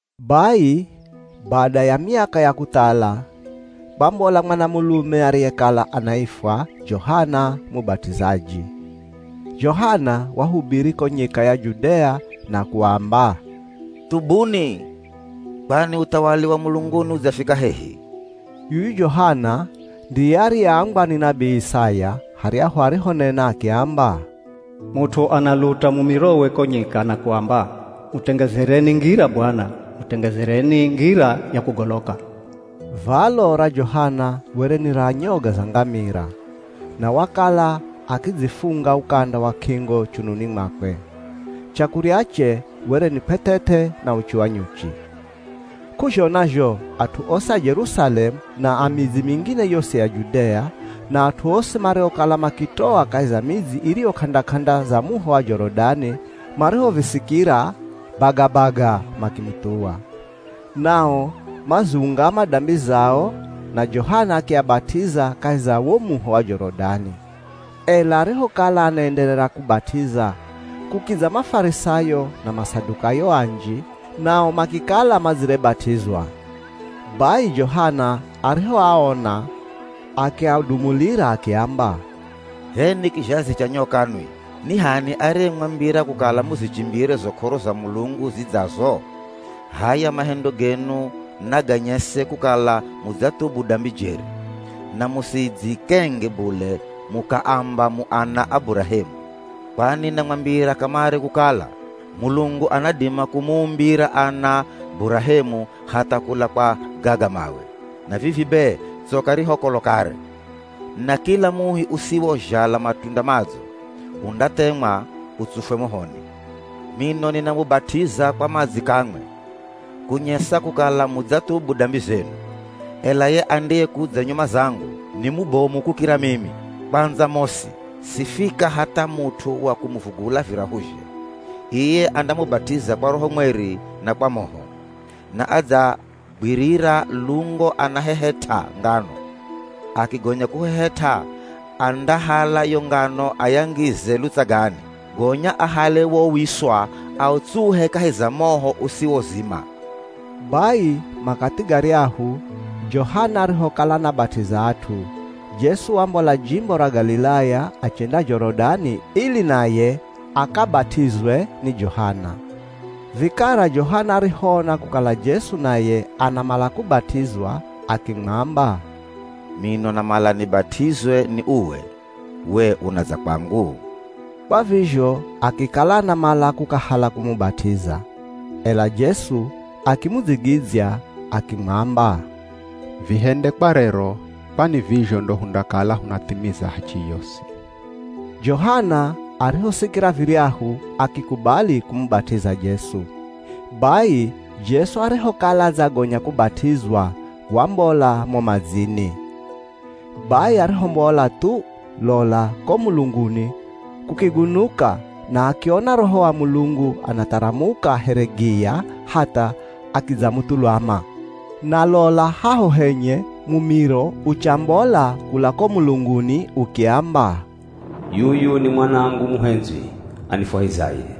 Bai bada ya miaka ya kuthala, kwambola mwanamulume ariyekala anaifwa Johana Mubat'izaji. Johana wahubiri ko nyika ya Judea na kuamba, “Thubuni, kwani uthawali wa mulunguni udzafika hehi.” Yuyu Johana ndiye ariyeambwa ni nabii Isaya haryahu arihonena akiamba, “Mut'u analuta mumirowe ko nyika na kuamba, ‘Mutengezereni ngira Bwana, Mutengezereni ngira ya kugoloka.’” Valo ra Johana were ni ra nyoga za ngamira. Na wakala akidzifunga ukanda wa k'ingo chununi mwakwe. Chakuryache were ni kw'eth'eth'e na uchi wa nyuchi. K'uzhona zho, at'u osi a Jerusalemu na a midzi mingine yosi ya Judea, na at'u osi mariokala makitoa kahi za midzi iriyo k'anda-k'anda za muho wa Jorodani marihovisikira, bagabaga makimuthuwa. Nao maziungama dambi zao, na Johana akiabat'iza kahi za wo muho wa Jorodani. Ela arihokala anaenderera kubat'iza, kukidza Mafarisayo na Masadukayo anji, nao makikala madzirebat'izwa. Bai Johana arihoaona, akiadumulira akiamba, “H'enwi kizhazi cha nyoka nwi! Ni h'ani ariyemwambira kukala muzichimbire zo k'oro za Mulungu zidzazo? H'aya mahendo genu naganyese kukala mudzathubu dambi jeri. Na musidzikenge bule mukaamba mu ana a Burahemu. Kwani namwambira kamare kukala, Mulungu anadima kumuumbira ana Burahemu hatha kula kwa gaga mawe! Na vivi be tsoka ri ho kolo kare, na kila muhi usiwozhala matunda madzo, undathemwa utsufwe mohoni. Mino ninamubat'iza kwa madzi kamwe, kunyesa kukala mudzathubu dambi zenu, ela ye andiyekudza nyuma zangu ni mubomu kukira mimi. Kwandza mosi sifika hatha mut'u wa kumuvula virahuzhe. Iye andamubat'iza kwa Roho Mweri na kwa moho. Na adzagwirira lungo anahehet'a ngano. Akigonya kuhehet'a andahala yo ngano ayangize lutsagani, gonya ahale wo wiswa autsuhe kahi za moho usiwozima.” Bai makathi garyahu Johana arihokala anabat'iza at'u, Jesu wambola jimbo ra Galilaya achenda Jorodani ili naye akabat'izwe ni Johana. Vikara Johana arihoona kukala Jesu naye anamala kubat'izwa akimwamba, “Mino namala nibat'izwe ni uwe, we unadza kwangu?” Kwa vizho akikala anamala kukahala kumubat'iza. Ela Jesu akimudzigidzya akimwamba, “Vihende kwa rero, kwani vizho ndo hundakala hunathimiza hachi yosi.” Johana arihosikira viryahu akikubali kumubat'iza Jesu. Bai, Jesu arihokala adzagonya kubat'izwa wambola mo madzini. Bai arihombola thu, lola ko mulunguni kukigunuka, na akiona Roho wa Mulungu anatharamuka here giya hatha akidzamuthulama. Na lola haho henye mumiro uchambola kula ko mulunguni ukiamba, “Yuyu ni Mwanangu muhendzwi, anifwahizaye.”